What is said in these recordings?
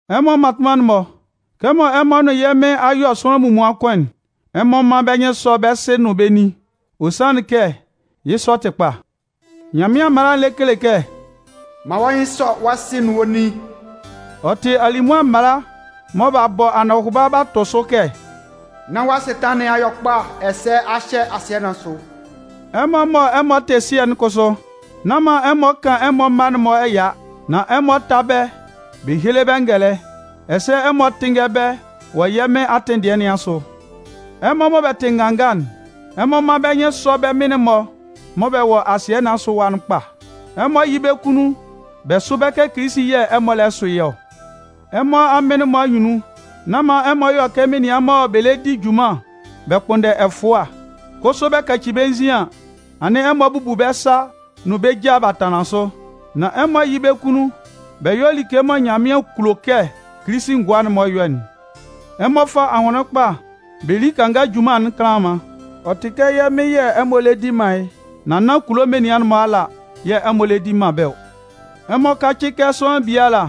Ɛmɔ mmatʋnman'n-mɔ, kɛmɔ ɛmɔ nʋn yɛ́ Mɩn a yɔ sʋanlan munmuan kʋn'n, ɛmɔ mán bɛ́ nyɩn sɔ́ bɛ́ sɩ nʋn bɛ́ nin. Ɔ sanlɩn kɛ yɩ́ sɔ tɩ kpa. Nyanmɩan mala'n lɛ kele kɛ: “Man wɔ́ nyɩn sɔ́ wɔ́ sɩ nʋn wɔ́ nin.” Ɔ tɩ alimʋa mala mɔ b'a bɔ anɔhʋba b'a tʋ sʋ kɛ: “Nán wɔ́ asɩtanlan nɩn a yɔ kpa ɛsɛ a hyɛ asɩɛ nɩn asʋ.” Ɛmɔ mɔ ɛmɔ tɩ sɩɛ'n kʋsʋ, nán man ɛmɔ kan ɛmɔ mma'n-mɔ ɛya. Nan ɛmɔ tá bɛ́ bɛ héle bɛ́ ngɛlɛ, ɛsɛ ɛmɔ tɩ́nngɛ bɛ́ wɔ yɛ́ Mɩn atɩn dɩɛ nɩn asʋ. Ɛmɔ mɔ ɛmɔ tɩ nganga'n, ɛmɔ mán bɛ́ nyɩn sɔ́ bɛ́ mɩn-mɔ mɔ bɛ wɔ asɩɛ nɩn asʋ ɛwa'n kpa. Ɛmɔ yɩ́ bɛ kunnun bɛ sʋ́ bɛ́ kɛ Kilisi yɛ̂ ɛmɔ lɛ sʋ yɩ́ ɔ. Ɛmɔ amɩn'n-mɔ anyunnun, nán man ɛmɔ yɔ kɛ menian mɔ bɛ lɛ di junman bɛ kpʋnndɛ ɛfʋa, kʋsʋ bɛ kaci bɛ́ nzin an, anɩn ɛmɔ a bubu bɛ́ sa nʋn bɛ́ ja b'a tanlan sʋ. Nan ɛmɔ yɩ́ bɛ́ kunnun bɛ yɔ́ like mɔ Nyanmɩan kulo kɛ Kilisi ngʋa'n-mɔ yɔ'n. Ɛmɔ fá ahʋnlɩn kpa bɛ lí kanga junman'n kanlanman. Ɔ tɩ kɛ yɛ́ Mɩn yɛ̂ ɛmɔ lɛ di man yɩ́, nan nán kulo menian'n-mɔ ala yɛ̂ ɛmɔ lɛ di man bɛ́ ɔ. Ɛmɔ kácɩ kɛ sʋanlan biala,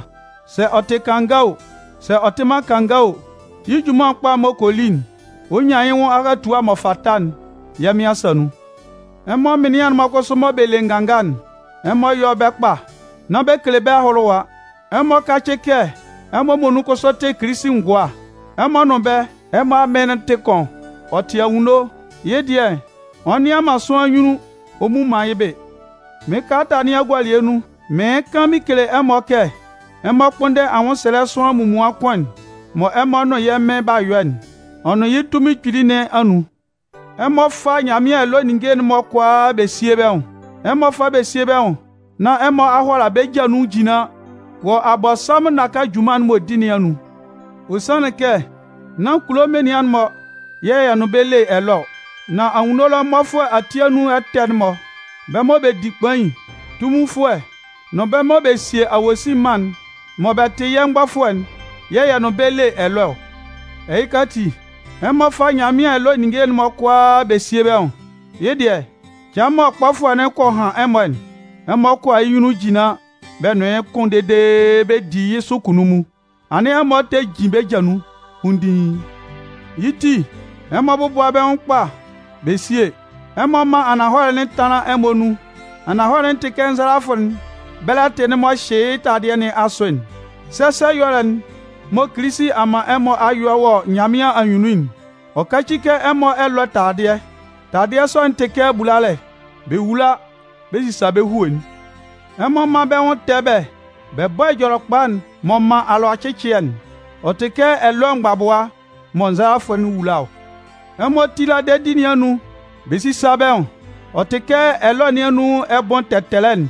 sɛ ɔ tɩ kanga o, sɛ ɔ tɩ man kanga o, yɩ́ junman kpa m'ɔ kɔ li'n, ɔ 'nyan yɩ́ nwʋn ahatua m'ɔ fata'n yɛ́ Mɩn asa nun. Ɛmɔ mɩnlɩan'n-mɔ kʋsʋ mɔ bɛ le nganga'n, ɛmɔ yɔ́ bɛ́ kpa. Nán bɛ kele bɛ́ ahʋlʋwʋa. Ɛmɔ kácɩ kɛ ɛmɔ muonun kʋsʋ tɩ Kilisi ngʋa. Ɛmɔ nʋn bɛ́, ɛmɔ Amɩn'n tɩ kʋn. Ɔ tɩ anwunno. Yɩ́ dɩɛ, ɔ nnɩan man sʋanlan nyunnun ɔ mmu man yɩ́ bɩ. Mɩ́n kalata nɩn agualɩɛ nun, mɩɩn kan mɩn kele ɛmɔ kɛ ɛmɔ kpʋ́nndɛ anwʋnsɛlɛ'n sʋanlan munmuan kʋn'n mɔ ɛmɔ nʋn yɛ́ Mɩn b'a yɔ'n, ɔ nʋn yɩ́ tunmin kpili nɩn anun. Ɛmɔ fá Nyanmɩan ɛlɔɛ ninnge'n-mɔ kʋalaa bɛ síe bɛ́ nwʋn. Ɛmɔ fá síe bɛ́ nwʋn nán ɛmɔ a hʋala bɛ́ ja nun jinlan wɔ Abɔnsanmʋn naka junman'n m'ɔ di nɩn anyunnun. Ɔ sanlɩn kɛ nán kulo menian'n-mɔ yɛ̂ yɛ nʋn bɛ́ le ɛlɔɛ ɔ. Nan anwunno ɛlɔ mmɔfʋɛ ati anun ɛtɛ'n-mɔ, bɛ́ mɔ bɛ di kpain, tunminfʋɛ nʋn bɛ́ mɔ bɛ sie awosin mân'n mɔ bɛ tɩ yɛ́ mgbɔfʋɛ'n yɛ̂ yɛ nʋn bɛ́ le ɛlɔɛ ɔ. Ɛhɩka ati, ɛmɔ fá Nyanmɩan ɛlɔɛ ninnge'n-mɔ kʋalaa bɛ síe bɛ́ nwʋn! Yɩ́ dɩɛ, cɩan mɔ kpɔfʋɛ'n kɔ han ɛmɔ'n, ɛmɔ 'kʋala yɩ́ nyunnun jinlan bɛ nʋn yɩ́ kʋn dede bɛ di yɩ́ sʋ kunnunmun, anɩn ɛmɔ tɛ jin bɛ́ ja nun kpunndiin. Yɩ́ ti, ɛmɔ bɔ́bʋa bɛ́ nwʋn kpa bɛ síe. Ɛmɔ mán ananhɔlɛ'n tánlan ɛmɔ anun. Ananhɔlɛ'n tɩ kɛ nzalafʋ'n bɛlɛtɩ'n m'ɔ hyɩ yɩ́ taladɩɛ nɩn asʋ'n. Sɛsɛ ɛyɔlɛ'n mɔ Kilisi a man ɛmɔ a yɔ wɔ Nyanmɩan anyunnun'n, ɔ káci kɛ ɛmɔ ɛlɔɛ taladɩɛ. Taladɩɛ sɔ'n tɩ bulalɛ. Bɛ wula bɛ sisa bɛ́ hue'n. Ɛmɔ mán bɛ́ nwʋn tɛ bɛ́ bɛ bɔ́ Ɛjɔlɛkpa'n m'ɔ man alʋacɩcɩɛ'n. Ɔ tɩ kɛ ɛlɔɛ mgbabʋa mɔ nzalafʋ'n wula ɔ. Ɛmɔ tíla dedi nɩn anun bɛ sísa bɛ́ nwʋn. Ɔ tɩ kɛ ɛlɔɛ nɩn anun ɛbʋɩn tɛtɛlɛ'n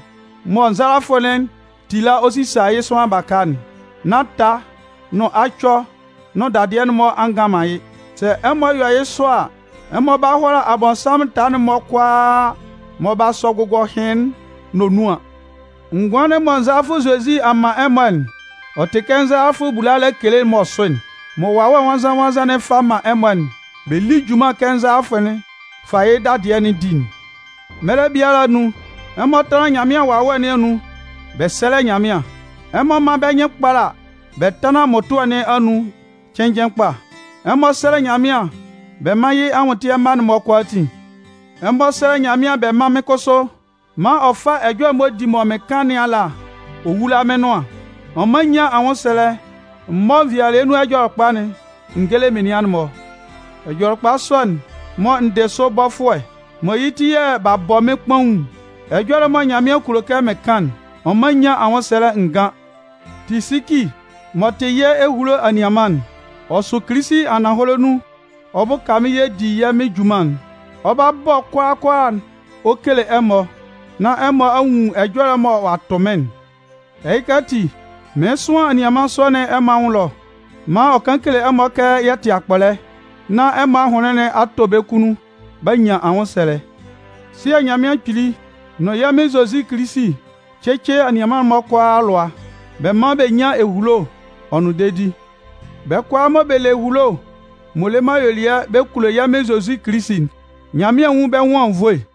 mɔ nzalafʋ'n tila ɔ sisa yɩ́ sʋanlan baka'n, nán taa nʋn acɔ nʋn dadɩɛ'n-mɔ a ngan man yɩ́. Sɛ ɛmɔ yɔ yɩ́ sɔ a, ɛmɔ 'ba hʋala Abɔnsanmʋn taa'n-mɔ kʋalaa mɔ b'a sɔ gʋgɔhɩn'n nonuan. Ngʋan'n mɔ Ngʋandefʋɛ Zozi a man ɛmɔ'n, ɔ tɩ kɛ nzalafʋ'n bulalɛ kele'n m'ɔ sʋ'n. Ɛmɔ fá Nyanmɩan Anʋan Ɛjɔlɛ'n mɔ Wawɛ Nwannzan-nwannzan'n fa man ɛmɔ'n bɛ lí junman kɛ nzalafʋ'n fa yɩ́ dadɩɛ'n di'n. Mɛlɛ biala anun, ɛmɔ tánlan Nyanmɩan Wawɛ nɩn anun bɛ sɛ́lɛ Nyanmɩan. Ɛmɔ mán bɛ́ nyɩn kpála bɛ tánlan mmʋtʋɛ nɩn anun cɩnnjɩn kpa. Ɛmɔ sɛ́lɛ Nyanmɩan bɛ mán yɩ́ anwʋntɩɛ mma'n-mɔ kʋalaatin. Ɛmɔ sɛ́lɛ Nyanmɩan bɛ mán mɩ́n kʋsʋ maan ɔ fá ɛjɔlɛ m'ɔ di mɔ mɩn kan nɩn ala ɔ wúla mɩ́n nʋan. Ɔ mán n nyán anwʋnsɛlɛ m mɔ́ nvɩalɩɛ Ɛjɔlɛkpa'n n géle menian'n-mɔ. Ɛjɔlɛkpa sɔ'n mɔ n dɩ sʋ bɔfʋɛ, mɔ yɩ́ ti yɛ̂ b'a bɔ mɩ́n kpaun'n, ɛjɔlɛ mɔ Nyanmɩan kulo kɛ mɩn kan'n, ɔ mán n nyán anwʋnsɛlɛ n gán. Tisiki m'ɔ tɩ yɛ́ ehulo anianman'n, ɔ sʋ Kilisi ananhɔlɛ nun ɔ bʋka mɩ́n yɛ di yɛ́ Mɩn junman'n. Ɔ 'ba bɔ kʋalaa kʋalaa'n ɔ kele ɛmɔ, nán ɛmɔ a nwun ɛjɔlɛ mɔ ɔ'a tʋ mɩ́n'n. Ɛhɩka ati, mɩɩn sʋan anianman sɔ'n ɛmɔ anwʋn ɛlɔ maan ɔ kan kele ɛmɔ kɛ yɛ tɩ akpɔlɛ, nán ɛmɔ ahʋnlɩn a tɔ bɛ́ kunnun b'a nyan anwʋnsɛlɛ. Sɩɛ Nyanmɩan Kpili nʋn yɛ́ Mɩn Zozi Kilisi cɩ́cɩ anianman'n-mɔ kʋalaa alʋa, bɛ mán bɛ nyán ehulo, ɔ nʋn dedi. Bɛ́ kʋalaa mɔ bɛ le ehulo m'ɔ le man ayuelɩɛ bɛ kulo yɛ́ Mɩn Zozi Kilisi'n, Nyanmɩan nwún bɛ́ nwʋn anwunnvoe.